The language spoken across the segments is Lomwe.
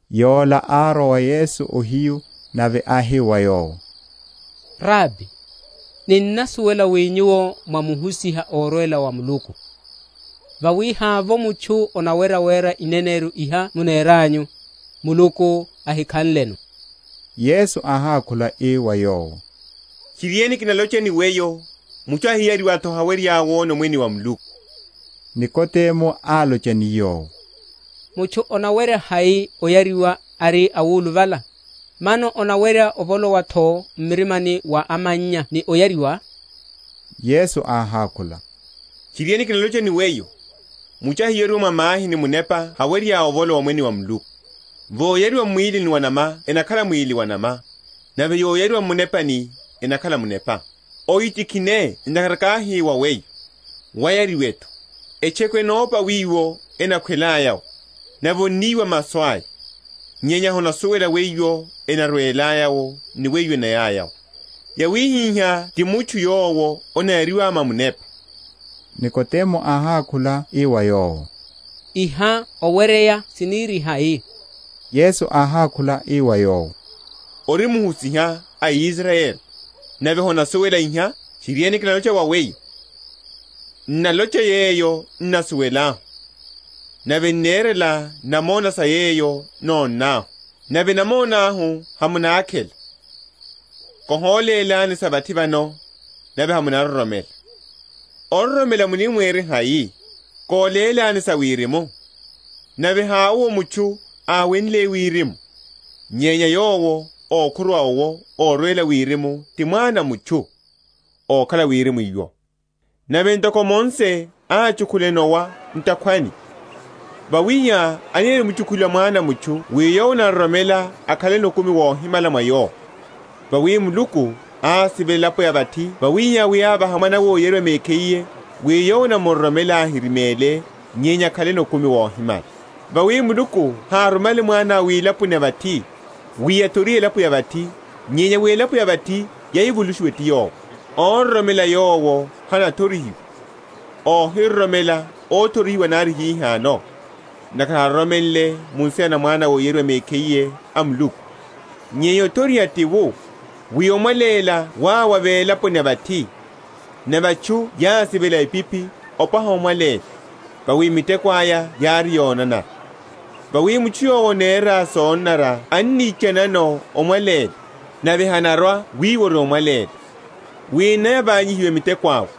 Yola árwa wa Yesu ohiyu, nave áhi wa Yowo, Rabi, ninnasuwela wi Nyuwo mwá Muhusiha órwela wa Muluku; vawi havovo mutchu anawerya wera ineneryo iha muneranyu, Muluku ahikhanleno. Yesu áhákhula ii wa yowo, Tchiriene, kinalocha ni weyo, mutchu áhiyariwa’tho, hawerya wona Omwene wa Muluku. Nikodemo álocha ni Yowo, Mutchu anawerya hai oyariwa ari awuluvala? Mano anawerya ovolowa’tho m’mirimani mwa amannya ni oyariwa? Yesu áhákhula, Tchiriene, kinalocha ni weyo, Mutchu áhiyariwa mwa mahi ni Munepa hawerya ovolowa omwene wa Muluku. Yoyariwa m’mwílini wa’nama enakhala mwíli wa’nama, nave yoyariwa m’Munepani, enakhala munepa. Ohitikhine ntakhara káhi wa weyo, Wayariwe’tho. Etcheku ennopa wiwo enakhwelaya’wo, nave onniwa masu aya, nyenya honasuwela wiwo enarwelaya’wo, ni wiwo enayaya’wo; yawihihá ti mutchu yowo anayariwa mwa Munepa. Nikodemo áhákhula ii wa Yowo, Iha oweryeya sinirihai? Yesu áhákhula ii wa yowo, Ori muhusiha a Israyeli, nave honasuwela iha? Tchiriene, kinalocha wa weyo, N’nalocha yeyo n’nasuwelahu, nave n’nerela namona sa yeyo nónnahu; nave namona ahu hamunakhela. Kólélani sa vathi vano, nave hamunaroromela, ororomela munirihai, kólélani sa Wirimu? Nave hawowo mutchu áwenle wirimu, nyenya Yowo ókhuruwa owo orwela wirimu, ti Mwana a mutchu, ókhala wirimu’wo. Nave ntoko Mose áchukhula enowa mu’takhwani, wawihihá anirimchukhuliwa Mwana a mutchu wi yowo anaroromela akhaleno okumi wohimala mwa Yowo. Vawi Muluku ásivela elapo ya vathi wawihihá, wi ávaha Mwana’we óyariwa mekhiye, wi yowo anaroromela ahirimele, nyenya akhaleno okumi wohimala. Vawi Muluku hárumale Mwana’we wilaponi ya vathi, wi athorihe elapo ya vathi, nyenya wi elapo ya vathi yavulushiwe ti Yowo. Óroromela Yowo hanathorihiwa; óhiroromela óthorihiwa nari hihano, ntakhara haroromenle mu nsina na Mwana óyariwa mekhiye a Muluku. Nyenya othoriha ti wu, wi omwaléla wárwa wilaponi ya vathi, nave atchu yásivela epiphi wopwaha omwaléla; vawi miteko aya yári yonanara. Vawi mutchu yowo anera sonanara annichanano omwaléla, nave hanarwa wiwo ori omwaléla, wi enavanyihiwe miteko awe.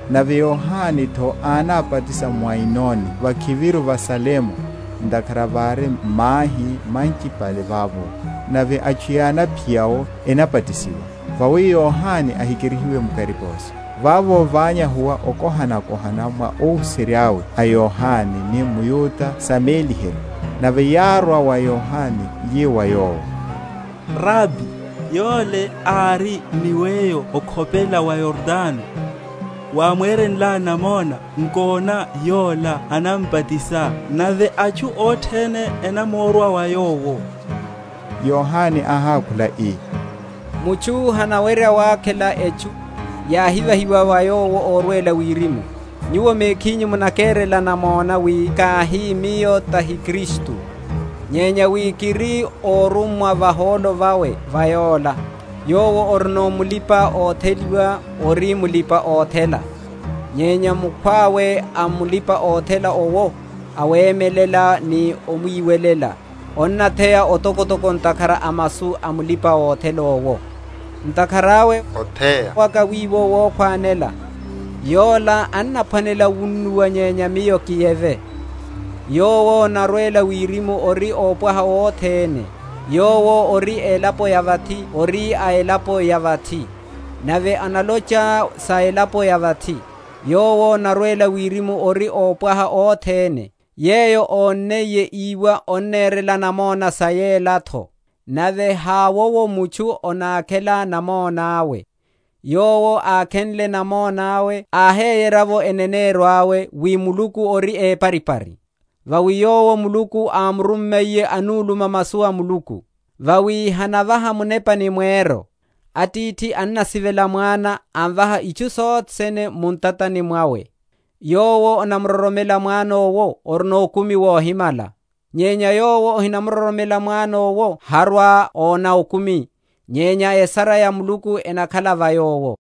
Nave Yohane’tho ánabatisa mu Ainoni vakhiviru va Salemu, ntakhara vári mahi manchipale vavo: nave atchu yánaphiya’wo, enabatisiwa. Vawi Yohane ahikerihiwe mu kariposo. Vavo ványahuwa okohanakohana mwa óhuserya’we a Yohane ni mYuda sa méliheryo. Nave yárwa wa Yohane, yi wa yowo, Rabi, Yole ári ni weyo okhopela wa Yordano, wámwerenlá namona, nkona yola anambatisa, nave atchu othene enamorwa wa Yowo. Yohane áhákhula ii, Mutchu hanawerya wakhela etchu, yahivahiwa wa yowo orwela wirimu. Nyuwo mekhinyu munakerela namona, wi káhi, Miyo tahi Kristu, nyenya wi kiri órummwa vahólo vawe va Yola. Yowo orino mulipa‐otheliwa ori mulipa‐othela, nyenya mukhwawe a mulipa‐othela owo, awemelela ni omwiwelela, onnatheya otokotoko ntakhara a masu a mulipa‐othela owo: ntakhara awe otheya waka wiwo wokhwanela. Yola anaphwanela wunnuwa, nyenya miyo kiyeve. Yowo anarwela wirimu ori ópwaha othene: yowo ori a elapo ya vathi ori a elapo ya vathi, nave analocha sa elapo ya vathi. Yowo anarwela wirimu ori ópwaha othene. Yeyo ónniye, íwa, annerela namona sa yelatho; nave hawowo mutchu anakhela namona’we. Yowo ákhenle namona’we áheyerya’vo eneneryo awe, wi Muluku ori eparipari. Vawi Yowo Muluku ámurummiye anuluma masu a Muluku: vawi hanavaha Munepa ni mweryo. Atithi annasivela Mwana, amvaha itchu sothe sene mu ntatani mwawe. Yowo anamuroromela Mwana owo orino okumi wohimala; nyenya yowo ahinamuroromela Mwana owo harwa‐ona okumi, nyenya esara ya Muluku enakhala va yowo.